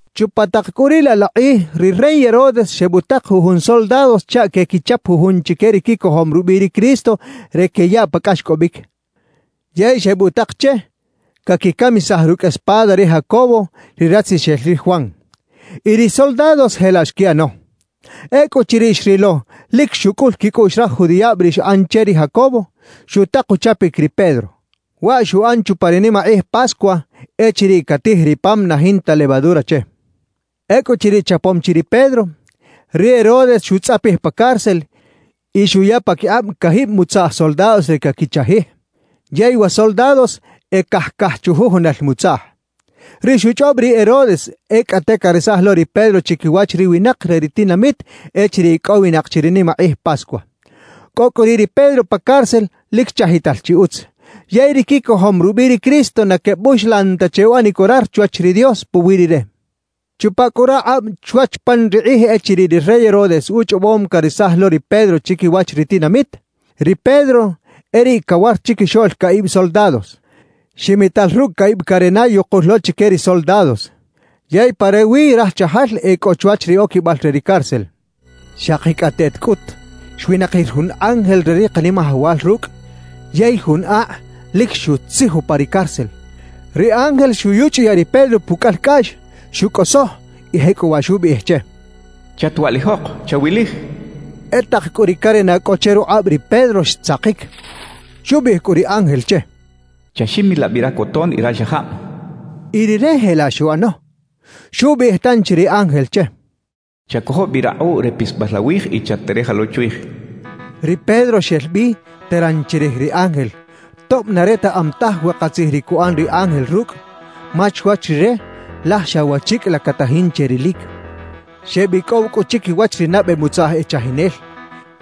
Chupa tak cꞌu riꞌ laꞌ la kꞌij ri rey Herodes xebutak jujun soldados chaꞌ quequichap jujun chique ri quicojom rubiꞌ ri Cristo re queyaꞌ pa cꞌaxcꞌobic. Yey xebutak che caquicamisaj rucꞌ espada ri Jacobo ri ratzixel ri Juan. Y ri soldados jelaꞌ xquiꞌano. Ecꞌuchiriꞌ xrilo lic xucꞌul quicꞌuꞌx raj judiꞌab ri xꞌan che ri Jacobo, xutak uchapic ri Pedro. Waꞌ xuꞌan chupa ri nimakꞌij Pascua echiriꞌ catij ri pam na jinta levadura che. Ecꞌuchiriꞌ chapom chi ri Pedro, ri Herodes xutzꞌapij pa cárcel y xuya paquikꞌab cajib mutzaꞌj soldados re caquichajij, yey wa soldados e cajcaj chujujunal mutzaꞌj. Ri xuchꞌob ri Herodes e cꞌate caresaj lo ri Pedro chiquiwach ri winak re ri tinamit echiriꞌ icꞌowinak chi ri nimakꞌij Pascua. Cꞌo cꞌu riꞌ ri Pedro pa cárcel lic chajital chi utz. Yey ri quicojom rubiꞌ ri Cristo na quebuxlan ta che uꞌanic orar chwach ri Dios puwiꞌ rire. Chupa cꞌu rakꞌab chwach pan ri kꞌij echiriꞌ ri rey Herodes uchꞌobom caresaj lo ri Pedro chiquiwach ri tinamit, ri Pedro e riꞌ cawar chiquixoꞌl caꞌib soldados, ximital rucꞌ caꞌib carena yukul lo chique ri soldados. Yey pa rewi raj chajal e cꞌo chwach ri oquibal re ri cárcel. Xakicꞌateꞌt cꞌut xwinakir jun ángel re ri Kanimajawal rucꞌ, yey jun akꞌ lic xutzij upa ri cárcel. Ri ángel xuyuchꞌuyaꞌ ri Pedro pucꞌalcꞌaꞌx, xucꞌosoj y jecꞌuwaꞌ xubiꞌij che: «Chatwaꞌlijok, chawilij» xcha che. E tak cꞌu ri carena cꞌo che rukꞌab ri Pedro xtzakic. Xubiꞌij cꞌu ri ángel che: «Chaximilaꞌ bi racoton y raxajab» xcha che. Y rire jelaꞌ xuꞌano. Xubiꞌij tanchi ri ángel che: «Chacojo bi rakꞌuꞌ re pisbal awij y chat-tereja lo chwij» xcha che. Ri Pedro xel bi teran chirij ri ángel, tob na retaꞌam taj we katzij ri cuꞌan ri ángel rucꞌ; ma chwach rire, laj xa wachicꞌ la catajin che rilic. Xebicꞌow cꞌu chiquiwach ri nabe mutzaꞌj e chajinel.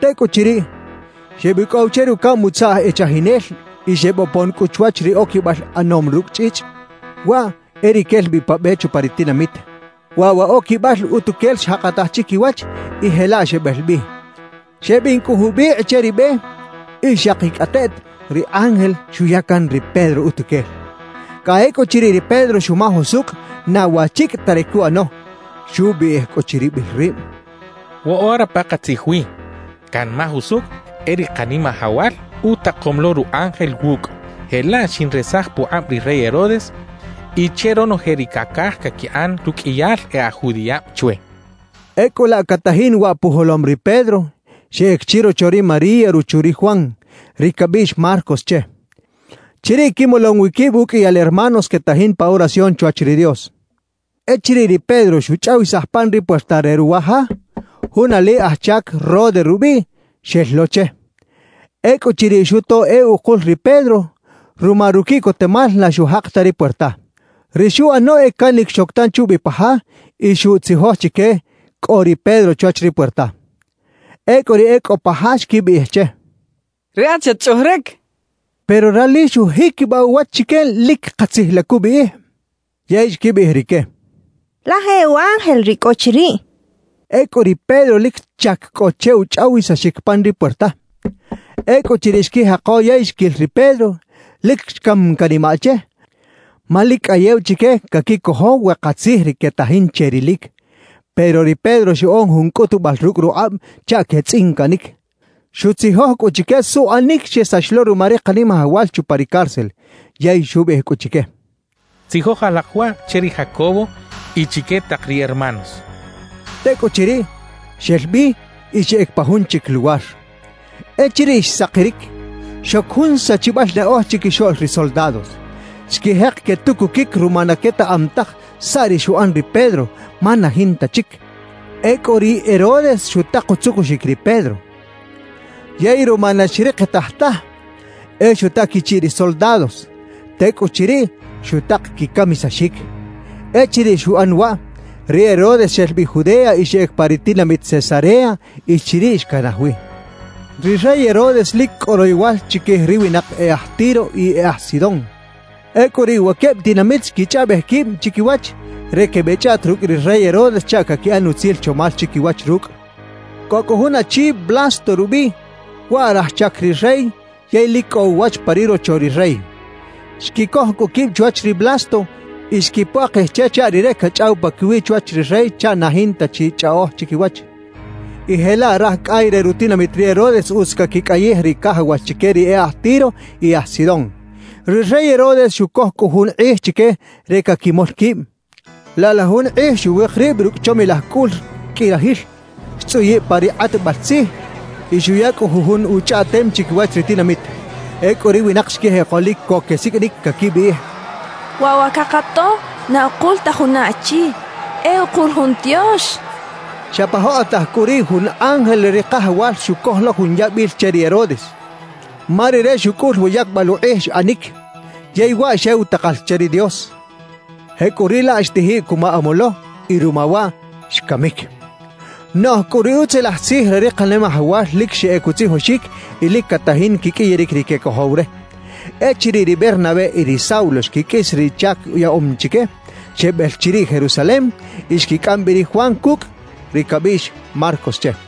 Tecꞌuchiriꞌ, xebicꞌow che rucaꞌm mutzaꞌj e chajinel y xebopon cꞌu chwach ri oquibal ꞌanom rucꞌ chꞌichꞌ, waꞌ e ri quel bi pa be chupa ri tinamit. Waꞌ wa oquibal utuquel xjakataj chiquiwach y jelaꞌ xebel bi. Xebin cꞌu jubikꞌ che ri be y xakicꞌateꞌt ri ángel xuya can ri Pedro utuquel. Cꞌa ecꞌuchiriꞌ ri Pedro xumaj usucꞌ na wachicꞌ ta ri cuꞌano. Xubiꞌij cꞌu chiribil rib: «Woꞌora pakatzij wi, canmaj usucꞌ e ri Kanimajawal utakom lo ru ángel wucꞌ. Jelaꞌ xinresaj pukꞌab ri rey Herodes y che ronoje ri cacaj caquiꞌan ruqꞌuiyal e aj judiꞌab chwe» xchaꞌ. Ecꞌu laꞌ catajin waꞌ pujolom ri Pedro, xeꞌec chirocho ri María ruchu ri Juan, ri cabiꞌx Marcos che. Chiriꞌ quimolom wi quib uqꞌuiyal hermanos quetajin pa oración chwach ri Dios. Echiriꞌ ri Pedro xuchꞌawisaj pan ri puerta re ruwa ja, jun ali aj chac Rode rubiꞌ, xel lo che. Ecꞌuchiriꞌ xuto e ukul ri Pedro, ruma ruquiꞌcotemal na xujak ta ri puerta. Ri xuꞌano e canic xoc tanchi ubi pa ja y xuꞌtzijoj chique cꞌo ri Pedro chwach ri puerta. Ecꞌu ri e cꞌo pa ja xquibiꞌij che: —Riꞌat xatchꞌuꞌjeric —xecha che. Pero rali xujiquibaꞌ uwach chique lic katzij la cubiꞌij. Yey xquibiꞌij rique: —Laj e u ángel ri cꞌo chiriꞌ —xechaꞌ. Ecꞌu ri Pedro lic chac cꞌo che uchꞌawisaxic pan ri puerta. Ecꞌuchiriꞌ xquijako yey xquil ri Pedro, lic xcam canimaꞌ che; ma lic cꞌayew chique caquicojo we katzij ri quetajin che rilic. Pero ri Pedro xuꞌan jun cꞌutubal rucꞌ rukꞌab chaꞌ quetzꞌincaꞌnic. Xutzijoj cꞌu chique suꞌanic xesax lo ruma ri Kanimajawal chupa ri cárcel. Yey xubiꞌij cꞌu chique: —Tzijoj alak waꞌ che ri Jacobo y chique tak ri hermanos —xchaꞌ. Tecꞌuchiriꞌ, xel bi y xeꞌec pa jun chic luwar. Echiriꞌ xsakiric, xoc jun sachibal naꞌoj chiquixoꞌl ri soldados. Xquijek quetucuquic ruma na quetaꞌam taj saꞌ ri xuꞌan ri Pedro, ma na jinta chic. Ecꞌu ri Herodes xutak utzucuxic ri Pedro. Yey ruma na xrikitaj taj, e xuta quichiꞌ ri soldados; tecꞌuchiriꞌ, xutak quicamisaxic. Echiriꞌ xuꞌan waꞌ, ri Herodes xel bi Judea y xeꞌec pa ri tinamit Cesarea y chiriꞌ xcanaj wi. Ri rey Herodes lic cꞌo royowal chiquij ri winak e aj Tiro y e aj Sidón. Ecꞌu riꞌ wa queb tinamit xquichꞌaꞌbej quib chiquiwach re quebeꞌchꞌaꞌta rucꞌ ri rey Herodes chaꞌ caquiꞌan utzil chomal chiquiwach rucꞌ. Cꞌo cꞌu jun achi Blasto rubiꞌ, waꞌ raj chac ri rey yey lic cꞌo uwach pa ri rocho ri rey. Xquicoj cꞌu quib chwach ri Blasto y xquipuakij che chaꞌ rire cachꞌaw paquiwiꞌ chwach ri rey chaꞌ na jinta chi chꞌaꞌoj chiquiwach. Y jelaꞌ raj cꞌay re rutinamit ri Herodes utz caquicꞌayij ri cajawax chique ri e aj Tiro y aj Sidón. Ri rey Herodes xucoj cꞌu jun kꞌij chique re caquimol quib. Laꞌ la jun kꞌij xuwik rib rucꞌ chomilaj cꞌul qꞌui rajil, xtzꞌuyiꞌ pa ri kꞌatbal tzij y xuya cꞌu jujun uchꞌaꞌtem chiquiwach ri tinamit. Ecꞌu ri winak xquijeko lic co quesiqꞌuinic caquibiꞌij: «¡Waꞌ wa cakato, na ukul ta juna achi; e ukul jun tiox!» quechaꞌ. Xa pa jokꞌotaj cꞌu riꞌ jun ángel re ri Kajawal xucoj lo jun yabil che ri Herodes; ma rire xucꞌul wa yacbal ukꞌij xꞌanic, yey waꞌ xew takal che ri Dios. Jecꞌuriꞌlaꞌ xtijiꞌ cuma amolo y ruma waꞌ xcamic. Noꞌj cꞌu ri Utzilaj Tzij re ri Kanimajawal lic xeꞌec utzijoxic y lic catajin quiqꞌuiyaric ri quecojow re. Echiriꞌ ri Bernabé y ri Saulo xquiqꞌuis ri chac yaꞌom chique, xebel chiriꞌ Jerusalem y xquicꞌam bi ri Juan cucꞌ, ri cabiꞌx Marcos che.